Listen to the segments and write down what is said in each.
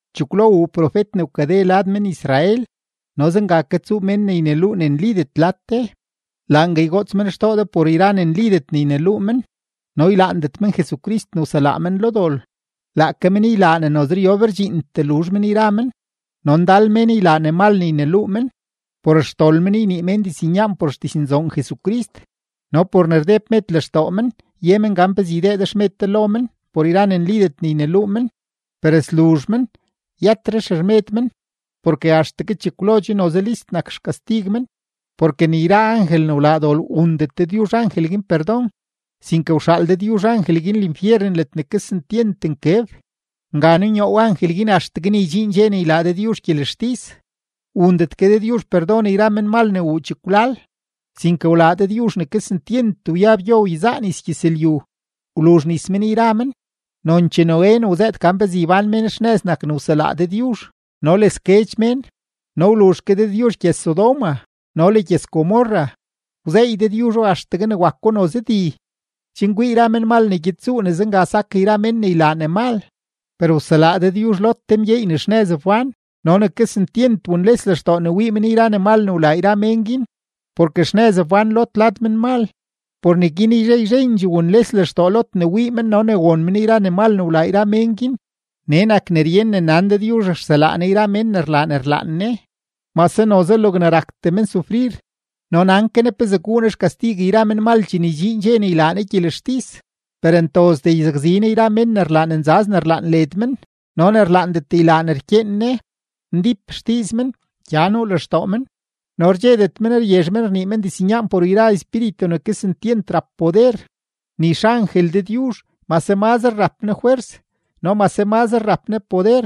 Chekwlo wuu profet ne wkade lad men-Israel, no zenga ke tsuu mén ne yneluu ne nlidet lad de. Laangue ygoots men xtoo de por yra ne nlidet ne yneluu men, no ylaandet men Jesucrist ne wselaa men lo dol; laake men ylaa ne noze ryob rdxiintee luzh men yra men. No ndal mén ylaa ne mal ne yneluu men; por xdol men ynii mén diznyaan por xdiznzoon Jesucrist. No por ne rdeb med lextoo men ye men gan pezee ydee de xmed de lo men por yra ne nlidet ne yneluu men. Per sluzh men, yëtetre xermed men, porke axtegue chekwlo che noze list nak xkastig men. Porke ni yra angel ne wlaa dol wundet Dëdyuzh angel guin perdon, sinke wxaal Dëdyuzh angel guin linfyeren ledne kesentyent nkeb, nga nunyoow angel guin axtegue ne ydxiin dxe ne ylaa Dëdyuzh gyelextis. Wundet ke Dëdyuzh perdon yra menmal ne wuu chekwlal, sinke wlaa Dëdyuzh ne kesentyent wyab gyo wyezaa nis gyëzlyu, wluzh nis men yra men. Nonchee Noé ne wzëët gan pezee ybán mén xnëz nak ne wselaa Dëdyuzh no le sguedx mén. No wluzh ke Dëdyuzh gyëz-Sodoma no le gyëz-Gomorra, wzeey Dëdyuzho axtegue ne wako noze di, chen kwii yra menmal ne gyed tsuu ne zenga sak yra mén ne ylaa ne mal. Per wselaa Dëdyuzh Lot te mgyeey ne xnëz wbán no ne kesentyent wunles lextoo ne wii men yra ne mal ne wlaa yra mén guin, porke xnëz wbán Lot lad menmal, por neguin yzhe yzhendxee wunles lextoo Lot ne wii men no ne won men yra ne mal ne wlaa yra mén guin. Nee nak ne ryen ne nan Dëdyuzh rselaa Ne yra mén ne rlaa ne rlaan Ne, mase noze logne raktee men sufrir, no nan ke Ne pezee guu Ne xkastig yra menmal chene ydxiin dxe ne ylaa Ne gyelextis. Per ntozdee yzakzi Ne yra mén ne rlaa ne nzaz ne rlaan led men no ne rlaandet ylaa ne rkyeen Ne. Ndíp xdiiz men, gya nuu lextoo men, no rdxedet men ryezh men rnii men diznyaan por yra espíritu ne kesentyent rap poder. Ni xangel Dëdyuzh, mase mazre rap ne fwers no mase mazre rap ne poder,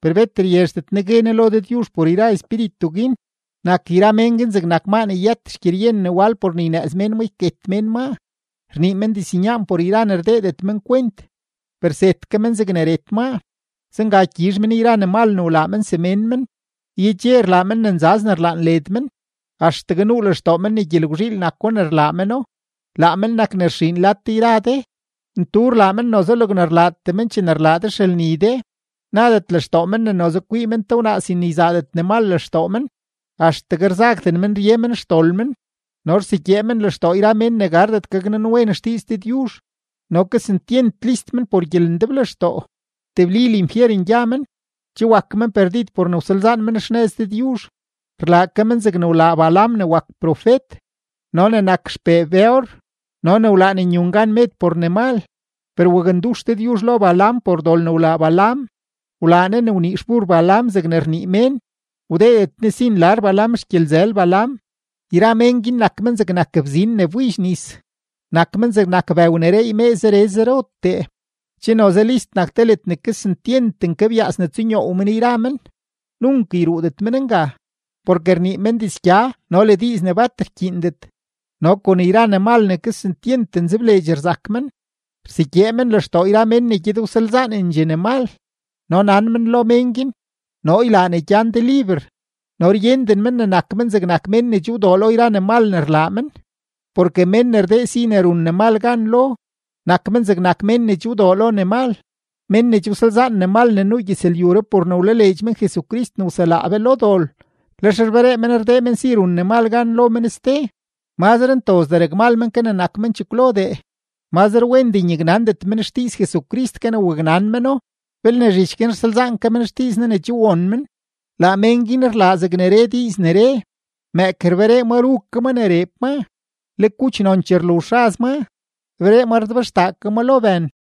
per bet ryezhdet ne gue ne lo Dëdyuzh por yra espíritu guin. Nak yra men guin zegnak maa ne yëtet xgyeryen ne wal por ne ynëëz mén maa yket mén maa. Rnii men diznyaan por yra ne rdeedet men kwent, per zet ke men zegne ret maa. Zenga gyizh men yra ne mal ne wlaa men semén men. Yedxe rlaa men ne nzaz ne rlaan led men, axtegue nuu lextoo men ne gyelgwzhiil nako ne rlaa meno; laa men nak ne rxiin lad de yra de, ntu rlaa men noze logne rlaatee men chene rlaa de xelni de. Nadet lextoo men ne noze kwii men te wnaa sin ne yzaadet ne mal lextoo men. Axtegue rzagden men rye xdol men, no rsegyee men lextoo yra mén ne gardet gaknanwen xdiiz Dëdyuzh. No kesentyent list men por gyelendeblextoo. Tebli linfyeren gya men. Che wak men perdid por ne wsalzaan men xnëz Dëdyuzh. Rlaa ke men zegne wlaa Balaam ne wak profet no ne nak xpee Beor no ne wlaan nyun gan med por ne mal. Per wakndux Dëdyuzh lo Balaam por dol ne wlaa Balaam; wlaa Ne ne wnii xbur Balaam zeg rnii mén, wdeedet Ne si nlar Balaam xgyelzël Balaam. Yra mén guin nak men zegnak bzin ne wbidx nis, nak men zegnak bëw ne reey mee zere zerotee. Che noze list nak te ledne kesentyent nkebyaas ne tsunyoow men yra men, nunk yruudet men nga. Porke rnii men dizgya no le diiz ne bat rkyiindet no kon yra ne mal ne kesentyent nzebleedx rzak men, rsegyee men lextoo yra mén ne gyed wsalzaanendxee ne mal. No nan men lo mén guin: “Noo ylaa ne gyan de liber”, no ryenden men ne nak men zegnak mén ne che wdoo lo yra ne mal ne rlaa men. Porke mén ne rdee si ne run ne mal gan lo, nak men zegnak mén che wdoo lo ne mal. Mén ne che wsalzaan ne mal ne nuu gyëzlyuree por ne wlaleedx men Jesucrist ne wselaa be lo dol lex rberee men rdee men si run ne mal gan lo men ste, mazre ntozdee rakmal men ke zegnak men chekwlodee. Mazre wendee nyaknandet men xdiiz Jesucrist ke ne waknan meno belne zhich guin rsalzaan ke men xdiiz Ne ne che won men. Laa men guin rlaa zegne re diiz ne re: “Mëëk rberee ma ru ke ma ne reeb maa, le kuch nonchee rluzh raz maa, rberee ma rdebxtaa ke maa lo bën.”